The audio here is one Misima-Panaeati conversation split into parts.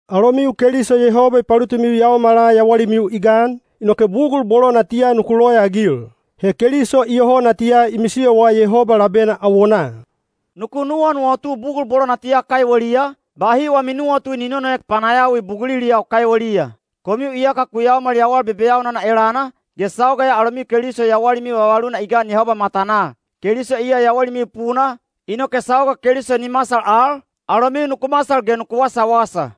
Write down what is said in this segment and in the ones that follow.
Alomiu Keliso Yehoba i palutimiu yaomala yawalimiu i gan, inoke bugul bolo natiya nuku loyaagil. He Keliso iyoho natiya i misiyowa Yehoba labena awonaa. Nuku nuwanuwatu bugul bolo natiya kaiweliya, bahi wami nuwatu ni nonoek panayawi buguliliyau kaiweliya. Komiu iyaka ku yaomal yawal bebeyaunana elana, ge sauga ya alomiu Keliso yawalimiu vavaluna i gan Yehoba matanaa. Keliso iya yawalimiu puna, inoke sauga Keliso ni masal al, alomiu nuku masal ge nuku wasawasa.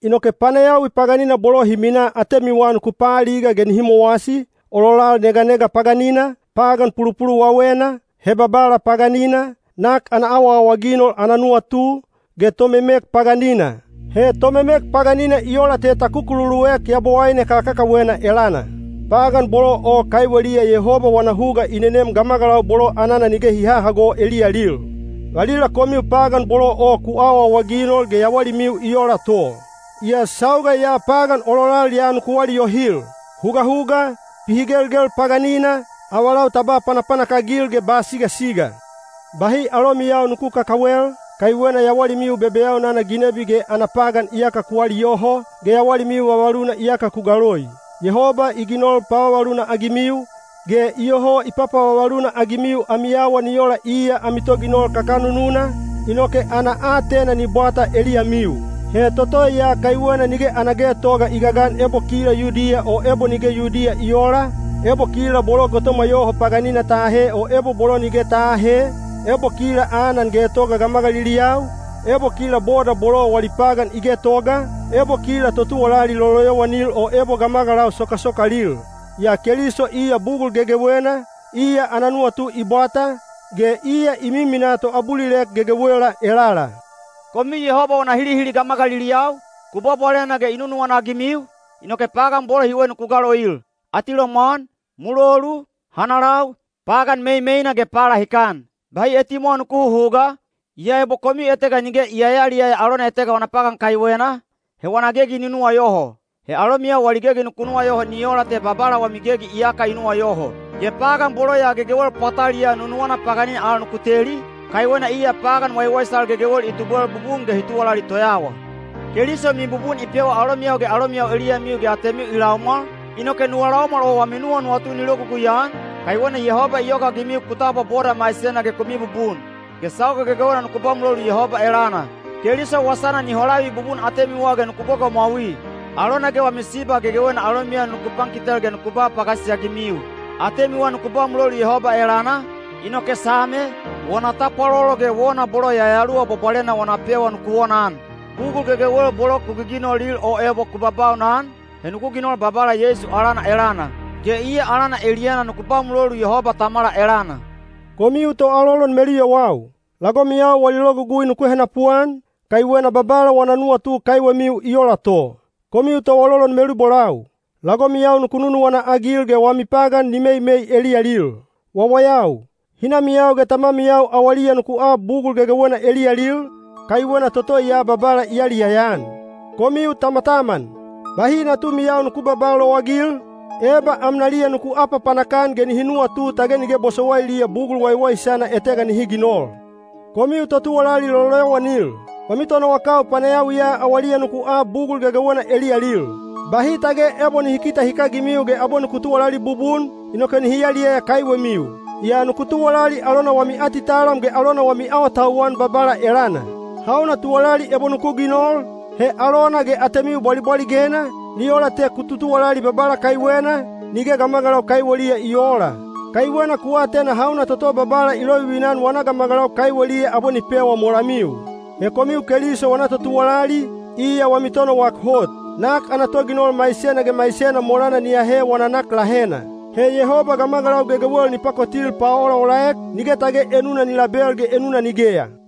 Inoke panayawi paganina bolo hi minaa atemiwa nuku paaliga ge nihi mowasi, ololal neganega paganina, pagan pulupuluwawena, hebabala paganina, nak ana awaawaginol ana nuwatu, ge tomemek paganina. (He tomemek paganina i ola te ta kukululuek yabowaine kakakawena elana.) Pagan bolo o kaiweliya Yehoba wana huga i nenem gamagalau bolo anana nige hi hahago eliyalil. Valila komiu pagan bolo o ku awaawaginol ge yawalimiu i ola to. Yaa sauga ya pagan ololal ya nuku aliyohil: hugahuga, pihigelgel paganina, avalau ta ba panapanak-agil ge ba sigasiga. Bahi alomiyau nuku kakawel, kaiwena yawalimiu bebeyaunana ginebi ge ana pagan iyaka ku aliyoho, ge yawalimiu vavaluna iyaka ku galoi. Yehoba i ginol pavavaluna-agimiu, ge iyoho i papavavaluna-agimiu ami awa ni ola iya ami Toginol kakanununa, inoke ana aatena ni bwata eliyamiu. He toto ya kaiwena nige ana getoga i gagan ebo kila Yudiya o ebo nige Yudiya i oola, ebo kila bolo gotomwa yoho paganina ta ahe o ebo bolo nige ta aahe, ebo kila anan getoga gamagaliliyau, ebo kila boda bolo wali pagan i getoga, ebo kila totuwalali loloyowanil o ebo gamagalau sokasokalil. Yaa Keliso iya bugul gegewena, iya ana nuwatu i bwata, ge iya i miminaa toabulilek gegewela elala. Komiu Yehoba wana hilihili gamagaliliyau, ku bwabwalena ge i nunuwana-agimiu, inoke pagan bolo hiwe nuku galoil: atilomwan, mulolu, hanalau, pagan meimeina ge palahikan. Bahi etimwawa nuku huhuga, yaa ebo komiu etega nige i yayaliyaya alona etega wana pagan kaiwena, he wana gegi ni nuwayoho. He alomiyau wali gegi nuku nuwayoho ni ola te Babala wami gegi iyaka i nuwayoho. Ge pagan bolo ya gegewel pwataliyaa nunuwana paganina al nuku teli, kaiwena iya pagan waiwaisal gegewel i tubwel bubun ge hi tuwalali toyawa. Keliso mibubun i pewa alomiyau ge alomiyau eliyamiu ge atemiu i laumwal, inoke nuwa laumwal o wami nuwanuwatu ni logugui-an, kaiwena Yehoba i yogaagimiu ku tabwa boda maisena ge ku mibubun. Ge sauga gegewena nuku ba mulolu Yehoba elana. Keliso wasana ni holavi bubun atemiwa ge nuku gogomwaui. Alona ge wami siba gegewena alomiyau nuku pankitel ge nuku ba pagasisi-agimiu. Atemiwa nuku ba mulolu Yehoba elana, inoke same, wona tapwalolo ge wona bolo Yayaluwa Bwabwalena wana pewa nuku wonaan. Bugul gegewel bolo ku giginolil o ebo ku baubaunan, he nuku ginol Babala Yeisu alana elana. Ge iya alana eliyana nuku ba mulolu Yehoba Tamala elana. Komiu toalolon meluyowau, lagomiyau wali logugui nuku henapuan, kaiwena Babala wana nuwatu kaiwemiu i ola to. Komiu toalolon melubolau, lagomiyau nuku nunuwana-agil ge wami pagan ni meimei eliyalil. Wawayau, hinamiyau ge tamamiyau awaliya nuku ab bugul gegewena eliyalil, kaiwena toto ya Babala i yaliyaya-an. Komiu tamataman, bahi natumiyau nuku babaa lowagil, eba amnaliya nuku apapanak-an ge nihi nuwatu tage nige bosowailiya bugul waiwaisana etega nihi ginol. Komiu totuwalali loloyowanil, wami tonowakau panayawiya awaliya nuku ab bugul gegewena eliyalil. Bahi tage ebo nihi kite hikagimiu ge abwe nuku tuwalali bubun, inoke nihi yaliyaya kaiwemiu. Yaa nuku tuwalali alona wami atitalam ge alona wami awatauwan Babala elana. Hauna tuwalali ebo nuku ginol, he alona ge atemiu bwalibwaligena, ni ola te ku tutuwalali Babala kaiwena, nige gamagalau kaiweliya i oola. Kaiwena ku atena hauna toto Babala i lovivina-an wana gamagalau kaiweliya abwe ni pewa molamiu. He komiu Keliso wana totuwalali, iya wami Tonowak hot. Nak ana toginol maisena ge maisena molana ni ahe wana nak lahena. He Yehoba gamagalau gegewel ni pakotil paolaolaek, nige tage enuna ni label ge enuna nigeya.